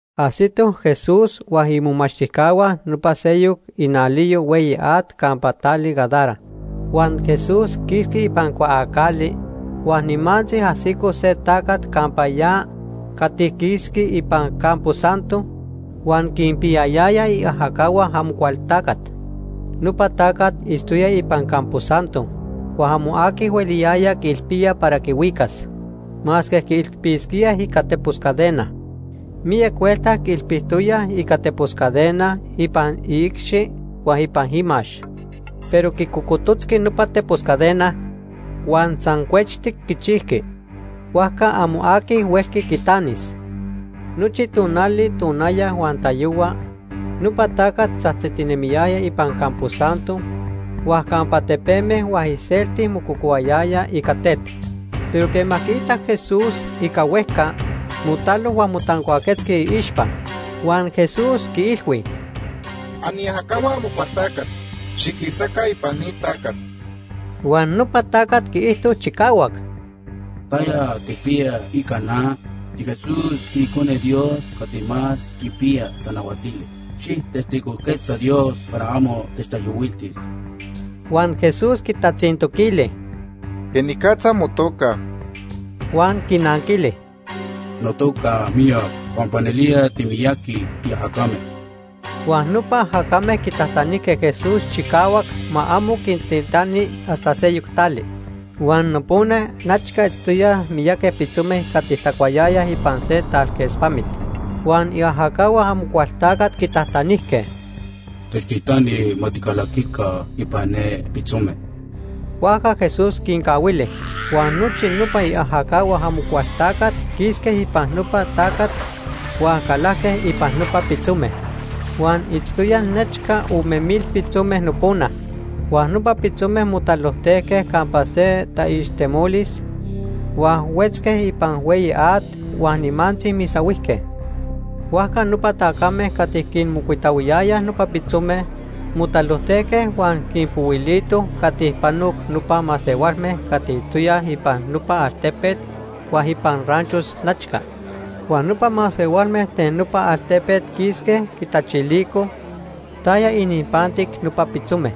Ajsitoj Jesús huan imomachtijcahua nopa seyoc inaliyo hueyi at campa tali Gadara. Huan Jesús quisqui ipan cuaacali huan nimantzi ajsico se tacat campa ya cati quisqui ipan campo santo huan quinpiyayaya iajacahua Amocualtacat. Nopa tacat itztoya ipan campo santo, huan amo aqui hueliyaya quiilpía para quihuicas, masque quiilpisquía ica tepos cadena. Miyac huelta quiilpitoyaj ica tepos cadena ipan iicxi huan ipan imax, pero quicocototzqui nopa tepos cadena, huan san cuechtic quichijqui. Huajca amo aqui huelqui quitanis. Nochi tonali tonaya huan tayohua nopa tacat tzajtzitinemiyaya ipan campo santo huan campa tepeme huan iselti mococohuayaya ica tet. Pero quema quiitac Jesús ica huejca, motalo huan motancuaquetzqui iixpa. Huan Jesús quiilhui: ―Aniajacahua Amocualtacat, xiquisaca ipan ni tacat. Huan nopa tacat quiijto chicahuac: ―¿Taya tijpiya ica na? TiJesús, tiIcone Dios Cati Más Quipiya Tanahuatili. Xijtestigojquetza Dios para amo techtaijyohuiltis. Huan Jesús quitatzintoquili: ―¿Quenicatza motoca? Huan quinanquili: ―Notoca, Miyac, pampa nelía timiyaqui tiajacame. Huan nopa ajacame quitajtanijque Jesús chicahuac ma amo quintitani hasta seyoc tali. Huan nopona nechca itztoyaj miyaqui pitzome cati tacuayayaj ipan se talquespamit. Huan iajacahua Amocualtacat quitajtanijque: ―Techtitani ma ticalaquica ipan ne pitzome. Huajca Jesús quincahuili. Huan nochi nopa iajacahua Amocualtacat quisque ipan nopa tacat huan calajque ipan nopa pitzome. Huan itztoyaj nechca ome mil pitzome nopona. Huan nopa pitzome motalojtejque campa se taixtemolis, huan huetzque ipan hueyi at, huan nimantzi misahuijque. Huajca nopa tacame cati quinmocuitahuiyayaj nopa pitzome motalojtejque huan quinpohuilitoj cati panoc nopa masehualme cati itztoyaj ipan nopa altepet huan ipan ranchos nechca. Huan nopa masehualme ten nopa altepet quisque quitachilicoj taya ininpantic nopa pitzome.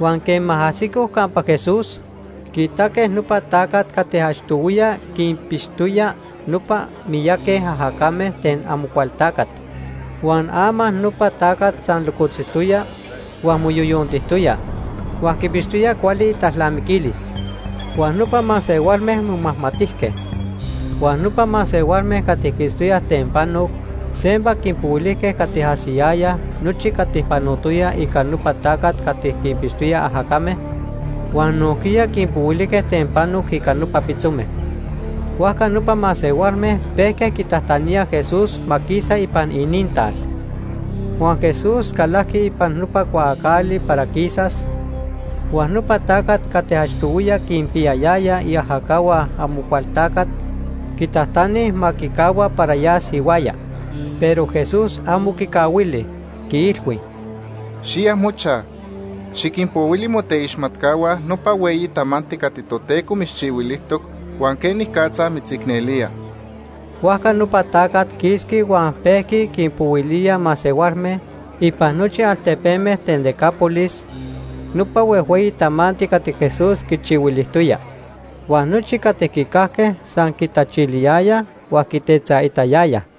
Huan quema ajsicoj campa Jesús, quiitaque nopa tacat cati achtohuiya quinpixtoya nopa miyaqui ajacame ten Amocualtacat. Huan ama nopa tacat san locotzijtoya, huan moyoyontijtoya, huan quipixtoya cuali italnamiquilis. Huan nopa masehualme momajmatijque. Huan nopa masehualme cati quiitztoyaj ten panoc sempa quinpohuilijque cati ajsiyayaj nochi cati panotoya ica nopa tacat cati quinpixtoya ajacame, huan nojquiya quinpohuilijque ten panoc ica nopa pitzome. Huajca nopa masehualme pejque quitajtaníaj Jesús ma quisa ipan inintal. Huan Jesús calajqui ipan nopa cuaacali para quisas, huan nopa tacat cati achtohuiya quinpiyayaya iajacahua Amocualtacat quitajtani ma quicahua para yas ihuaya. Pero Jesús amo quicahuili. Quiilhui: ―Xiya mochaj, xiquinpohuili moteixmatcahua nopa hueyi tamanti cati Toteco mitzchihuilijtoc huan quenicatza mitzicnelía. Huajca nopa tacat quisqui huan pejqui quinpohuilía masehualme ipan nochi altepeme ten Decápolis nopa huejhueyi tamanti cati Jesús quichihuilijtoya. Huan nochi cati quicajque san quitachiliyayaj huan quitetzaitayayaj.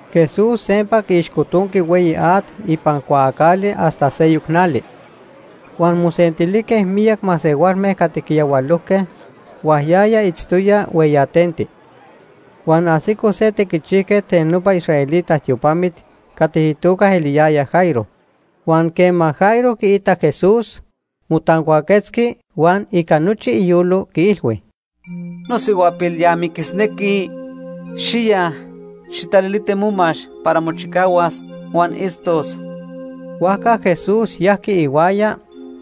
Jesús sempa quiixcotonqui hueyi at ipan cuaacali hasta seyoc nali. Huan mosentilijque miyac masehualme cati quiyahualojque, huan yaya itztoya hueyatenti. Huan ajsico se tequichijquet ten nopa israelita tiopamit cati itoca eliyaya Jairo. Huan quema Jairo quiitac Jesús, motancuaquetzqui, huan ica nochi iyolo, quiilhui: ―Nosihuapil ya miquisnequi. Xiya, xijtaliliti momax para mochicahuas huan itztos. Huajca Jesús yajqui ihuaya,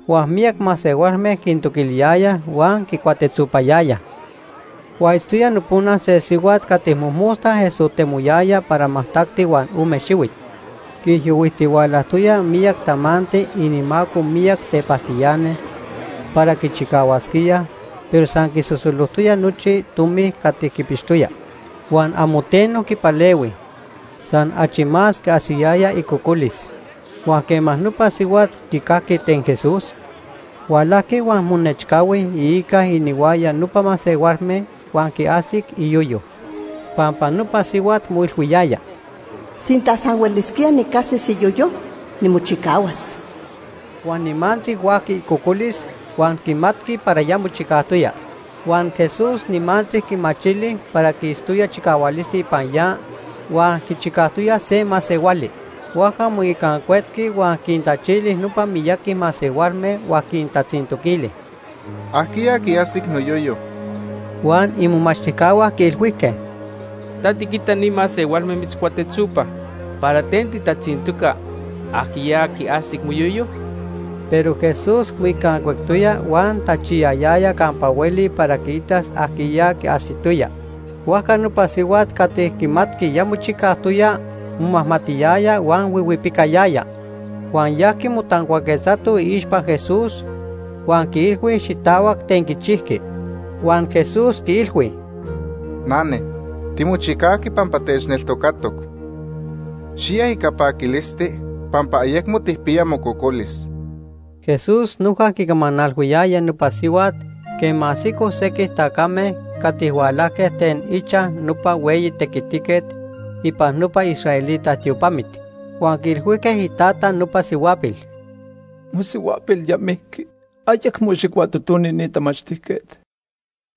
huan miyac masehualme quintoquiliyayaj huan quicuatetzopayayaj. Huan itztoya nopona se sihuat cati mojmosta esotemoyaya para majtacti huan ome xihuit. Quiijyohuijtihualajtoya miyac tamanti inimaco miyac tepajtiani para quichicahuasquíaj pero san quisosolojtoya nochi tomi cati quipixtoya, huan amo teno quipalehui. San achi más quiajsiyaya icocolis. Huan quema nopa sihuat quicajqui ten Jesús, hualajqui huan monechcahui iica inihuaya nopa masehualme, huan quiajsic iyoyo. Pampa nopa sihuat moilhuiyaya: “Sinta san huelisquía nicajsis iyoyo, nimochicahuas.” Huan nimantzi huajqui icocolis, huan quimatqui para ya mochicajtoya. Huan Jesús nimantzi quimachili para quistoya chicahualisti ipan ya huan quichicajtoya se masehuali. Huajca moicancuetqui huan quintachili nopa miyaqui masehualme huan quintatzintoquili: ―¿Ajquiya quiajsic noyoyo? Huan imomachtijcahua quiilhuijque: ―Ta tiquita ni masehualme mitzcuatetzopaj, ¿para ten titatzintoca, ajquiya quiajsic moyoyo? Pero Jesús moicancuectoya huan tachiyayaya campa hueli para quiitas ajquiya quiajsitoya. Huajca nopa sihuat cati quimatqui ya mochicajtoya momajmatiyaya huan huihuipicayaya. Huan yajqui motancuaquetzato iixpa Jesús, huan quiilhui xitahuac ten quichijqui. Huan Jesús quiilhui: ―Nane, timochicajqui pampa techneltocatoc. Xiya ica paquilisti, pampa ayecmo tijpiya mococolis. Jesús noja quicamanalhuiyaya nopa sihuat quema ajsicoj sequij tacame cati hualajque ten ichaj nopa hueyi tequitiquet ipan nopa israelita tiopamit. Huan quiilhuijque itata nopa sihuapil: ―Mosihuapil ya mijqui. Ayecmo xijcuatotoni ni tamachtijquet.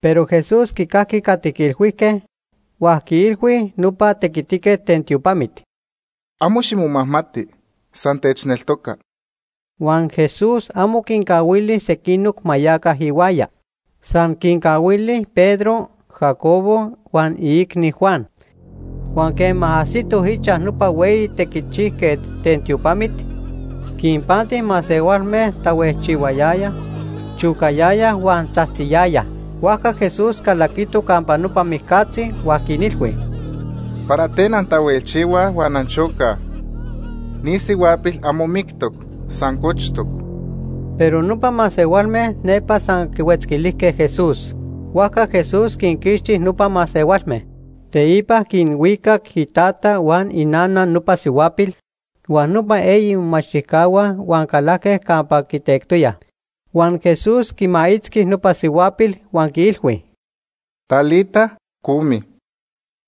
Pero Jesús quicajqui cati quiilhuijque, huan quiilhui nopa tequitiquet ten tiopamit: ―Amo ximomajmati, san techneltoca. Huan Jesús amo quincahuili sequinoc ma yaca ihuaya. San quincahuili Pedro, Jacobo huan iicni, Juan. Huan quema ajsitoj ichaj nopa hueyi tequichijquet ten tiopamit, quinpanti masehualme tahuejchihuayayaj, chocayayaj huan tzajtziyayaj. Huajca Jesús calaquito campa nopa mijcatzi, huan quinilhui: ―¿Para ten antahuejchihuaj huan anchocaj? Ni sihuapil amo mictoc, san cochtoc. Pero nopa masehualme nepa san quihuetzquilijque Jesús. Huajca Jesús quinquixti nopa masehualme. Teipa quinhuicac itata huan inana nopa sihuapil huan nopa eyi imomachtijcahua huan calajque campa quitectoyaj. Huan Jesús quimaitzqui nopa sihuapil huan quiilhui: ―Talita, cumi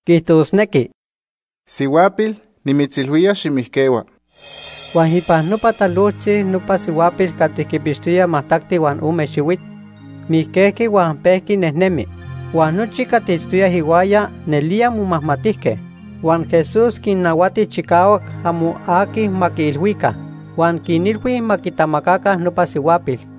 (quiijtosnequi: ‘Sihuapil, nimitzilhuía, ximijquehua.’) Huan ipan nopa talojtzi nopa sihuapil cati quipixtoya majtacti huan ome xihuit, mijquejqui huan pejqui nejnemi, huan nochi cati itztoyaj ihuaya nelía momajmatijque. Huan Jesús quinnahuati chicahuac amo aqui ma quiilhuica. Huan quinilhui ma quitamacaca nopa sihuapil.